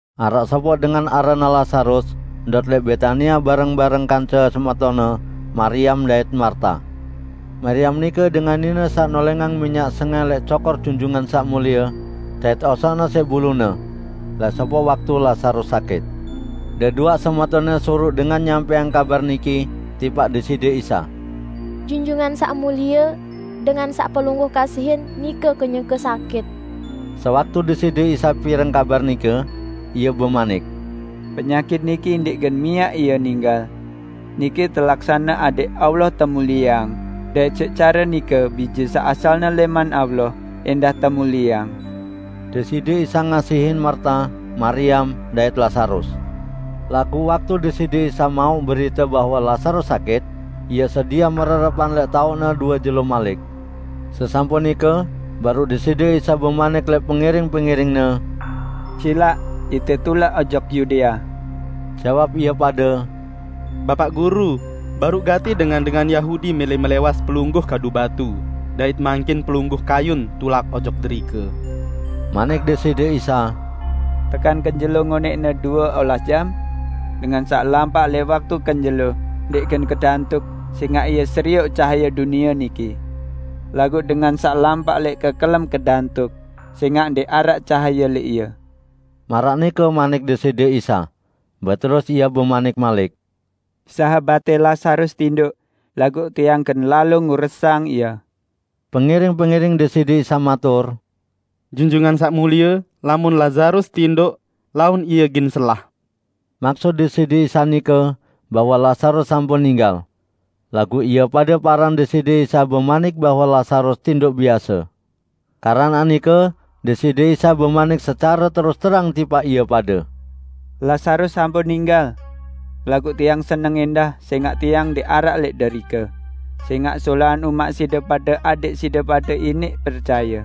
Araq sopoq dengan aranne Lazarus ndot lẽq Betania bareng-bareng kance semetonne Mariam dait Marta. Mariam nike dengan nine saq nolẽngang minyak sengẽh lẽq cokor Junjungan Saq Mulie, dait osokne siq bulune. Lẽq sopoq waktu Lazarus sakit. Deduaq semetonne suruq dengan nyampẽang kabar niki tipaq Deside Isa, "Junjungan Saq Mulie, dengan saq Pelungguh kasihin nike kenyeke sakit." Sewaktu Deside Isa pireng kabar nike, Ie bemanik, "Penyakit niki ndẽq gen miaq ie ninggal. Niki telaksane adẽq Allah temulieang dait siq care nike Bije saq asalne lẽman Allah ẽndah temulieang." Deside Isa ngasihin Marta, Mariam dait Lazarus. Laguq waktu Deside Isa mauq berite bahwe Lazarus sakit, Ie sediah mererepan lẽq taoqne due jelo malik. Sesampun nike baruq Deside Isa bemanik lẽq pengiring-pengiring-Ne, "Silaq ite tulak ojok Yudea." Jawab ie pade, "Bapaq Guru, baruq gati dengan-dengan Yahudi mẽlẽ melẽwas Pelungguh kadu batu dait mangkin Pelungguh kayun tulak ojok derike?" Manik Deside Isa, "Tekan kenjelo ngonẽqne due olas jam? Dengan saq lampaq lẽq waktu kenjelo, ndẽq gen kedantuk sẽngaq ie serioq cahaye dunie niki. Laguq dengan saq lampaq lẽq kekelem kedantuk, sẽngaq ndẽq araq cahaye lẽq ie." Maraq nike manik Deside Isa. Beterus Ie bemanik malik, "Sahabatte Lazarus tindoq, laguq Tiang gen lalo nguresang ie." Pengiring-pengiring Deside Isa matur, "Junjungan Saq Mulie, lamun Lazarus tindoq, laun ie gen selah." Maksut Deside Isa nike bahwe Lazarus sampun ninggal. Laguq ie pade paran Deside Isa bemanik bahwe Lazarus tindoq biase. Keranaq nike Deside Isa bemanik secare terus-terang tipaq ie pade, "Lazarus sampun ninggal. Laguq Tiang seneng ẽndah sẽngaq Tiang ndẽq araq lẽq derike, sẽngaq solahan umaq side pade adẽq side pade iniq percaye.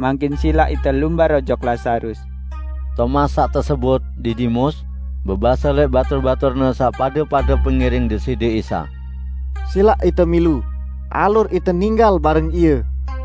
Mangkin silaq ite lumbar ojok Lazarus." Tomas saq tesebut, "Didimus" bebase lẽq batur-baturne saq pade-pade pengiring Deside Isa, "Silaq ite milu, alur ite ninggal bareng Ie."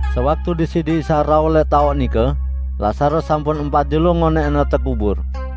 Sewaktu Deside Isa rauh lẽq taoq nike, Lazarus sampun empat jelo ngonẽqne tekubur.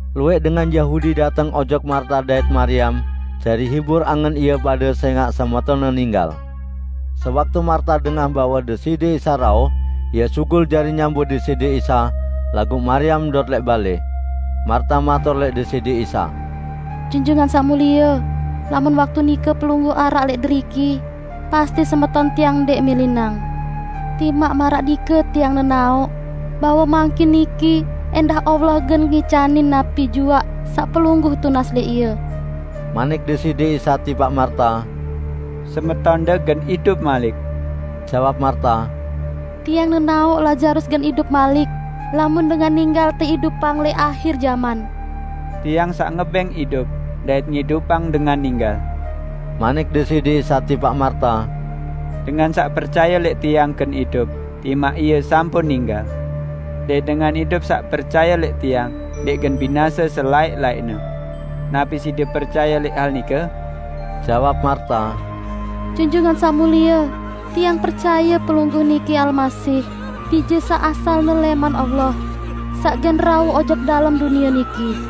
Luwẽq dengan Yahudi dateng ojok Marta dait Mariam jari hibur angen ie pade sẽngaq semetonne ninggal. Sewaktu Marta dengah bahwe Deside Isa rauh, ie sugul jari nyambut Deside Isa, laguq Mariam ndot lẽq balẽ. Marta matur lẽq Deside Isa, "Junjungan Saq Mulie, lamun waktu nike Pelungguh araq lẽq deriki, pasti semeton tiang ndẽq milinang. Timaq maraq nike tiang nenaoq bahwe mangkin niki ẽndah Allah gen ngicanin napi juaq saq Pelungguh tunas lẽq Ie." Manik Deside Isa tipaq Marta, "Semetonde gen idup malik." Jawab Marta, "Tiang nenaoq Lazarus gen idup malik lamun dengan ninggal teidupang lẽq ahir jaman." "Tiang saq ngebẽng idup dait ngidupang dengan ninggal." Manik Deside Isa tipaq Marta, "Dengan saq percaye lẽq Tiang gen idup, timaq ie sampun ninggal. Dait dengan idup saq percaye lẽq Tiang, ndẽq gen binase selaẽq-laẽqne. Napi side percaye lẽq hal nike?" Jawab Marta, "Junjungan Saq Mulie, tiang percaye Pelungguh niki Almasih, Bije saq asalne lẽman Allah, saq gen rauh ojok dalem dunie niki."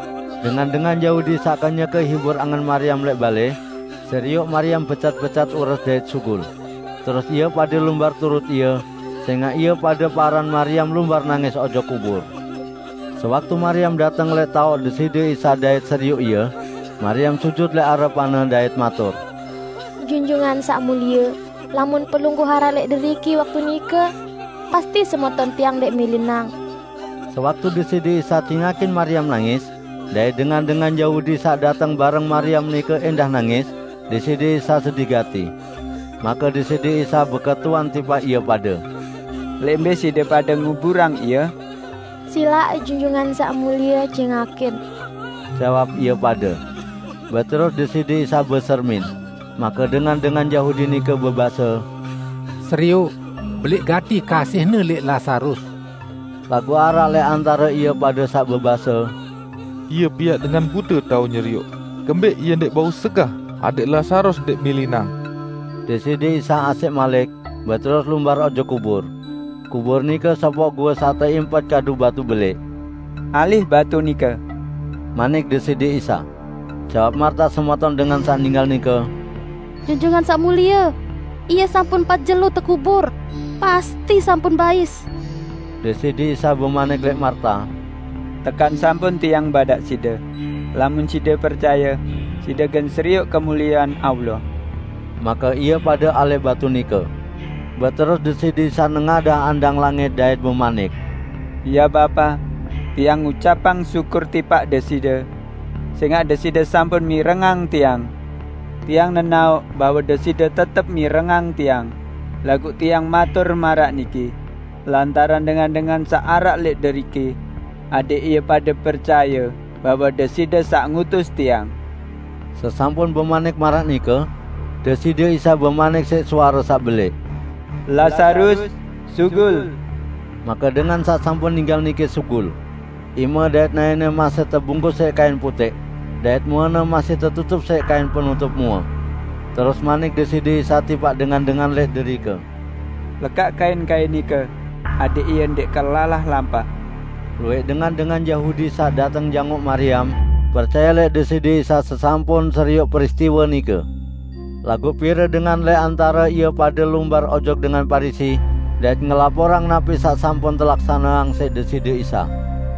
Dengan-dengan Yahudi saq kenyeke hibur angen Mariam lẽq balẽ, serioq Mariam becat-becat ures dait sugul; terus ie pade lumbar turut ie, sẽngaq ie pade paran Mariam lumbar nangis ojok kubur. Sewaktu Mariam dateng lẽq taoq Deside Isa dait serioq Ie, Mariam sujut lẽq arepan-Ne dait matur, "Junjungan Saq Mulie, lamun Pelungguh araq lẽq deriki waktu nike, pasti semeton tiang ndẽq milinang." Sewaktu Deside Isa cingakin Mariam nangis, dait dengan-dengan Yahudi saq dateng bareng Mariam nike ẽndah nangis, Deside Isa sedih gati. Make Deside Isa beketuan tipaq ie pade, "Lẽq mbẽ side pade nguburang ie?" "Silaq Junjungan Saq Mulie cingakin," jawab ie pade. Beterus Deside Isa besermin. Make dengan-dengan Yahudi nike bebase, "Serioq, belẽq gati kasih-Ne lẽq Lazarus!" Laguq araq lẽq antare ie pade saq bebase, "Ie piaq dengan bute tao nyerioq, kembẽq Ie ndẽq bau segah adẽq Lazarus ndẽq milinang?" Deside Isa asẽq malik, beterus lumbar ojok kubur. Kubur nike sopoq goe saq teimpet kadu batu belẽq. "Alih batu nike," manik Deside Isa. Jawab Marta semeton dengan saq ninggal nike, "Junjungan Saq Mulie, ie sampun empat jelo tekubur. Pasti sampun bais!" Deside Isa bemanik lẽq Marta, "Tekan sampun Tiang badaq side: Lamun side percaye, side gen serioq kemuliean Allah!" Make ie pade alih batu nike. Beterus Deside Isa nengadah andang langit dait bemanik, "Ya Bapa, Tiang ngucapang syukur tipaq Deside, sẽngaq Deside sampun mirengang Tiang. Tiang nenaoq bahwe Deside tetep mirengang Tiang, laguq Tiang matur maraq niki, lantaran dengan-dengan saq araq lẽq deriki; adẽq ie pade percaye bahwe Deside saq ngutus Tiang." Sesampun bemanik maraq nike, Deside Isa bemanik siq suare saq belẽq, "Lazarus, sugul!" Make dengan saq sampun ninggal nike sugul. Ime dait naẽne masih tebungkus siq kain putẽq, dait muene masih tetutup siq kain penutup mue. Terus manik Deside Isa tipaq dengan-dengan lẽq derike, "Lekaq kain-kain nike adẽq ie ndẽq kelalah lampaq." Luwẽq dengan-dengan Yahudi saq dateng jangoq Mariam, percaye lẽq Deside Isa sesampun serioq peristiwe nike. Laguq pire dengan lẽq antare ie pade lumbar ojok dengan Parisi dait ngelaporang napi saq sampun telaksaneang siq Deside Isa.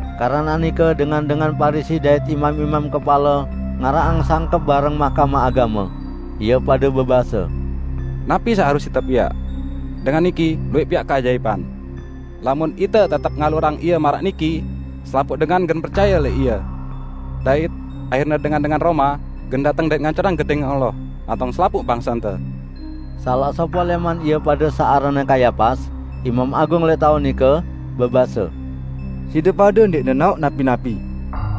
Keranaq nike dengan-dengan Parisi dait imam-imam kepale ngaraqang sangkep bareng Mahkamah Agame. Ie pade bebase, "Napi saq harus ite piaq? Dengan niki luwẽq piaq keajaipan! Lamun ite tetep ngalurang Ie maraq niki selapuq dengan gen percaye lẽq Ie! Dait ahirne dengan-dengan Roma gen dateng dait ngancurang Gedẽng Allah lantong selapuq bangsente!" Salaq sopoq lẽman ie pade saq aranne Kayapas, Imam Agung lẽq taun nike, bebase, "Side pade ndẽq nenaoq napi-napi.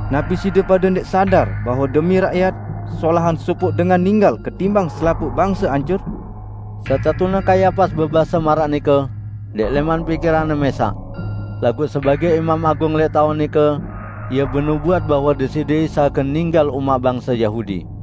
Napi side pade ndẽq sadar bahwe demi rakyat, solahan sopoq dengan ninggal ketimbang selapuq bangse ancur?" Setetune Kayapas bebase maraq nike, ndẽq lẽman pikiranne mẽsaq. Laguq sebagẽ Imam Agung lẽq taun nike ie benubuat bahwe Deside Isa gen ninggal umaq bangse Yahudi.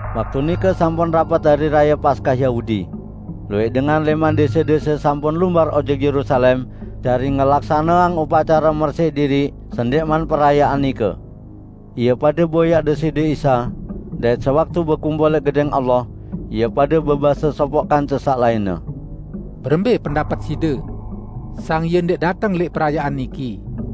Waktu nike sampun rapet Hari Raye Paskah Yahudi. Luwẽq dengan lẽman dẽse-dẽse sampun lumbar ojok Yerusalem jari ngelaksaneang upacare mersiq diriq sendẽqman perayaan nike. Ie pade boyaq Deside Isa, dait sewaktu bekumpul lẽq Gedẽng Allah, ie pade bebase sopoq kance saq lainne, "Berembẽ pendapet side? Sang Ie ndẽq dateng lẽq perayaan niki."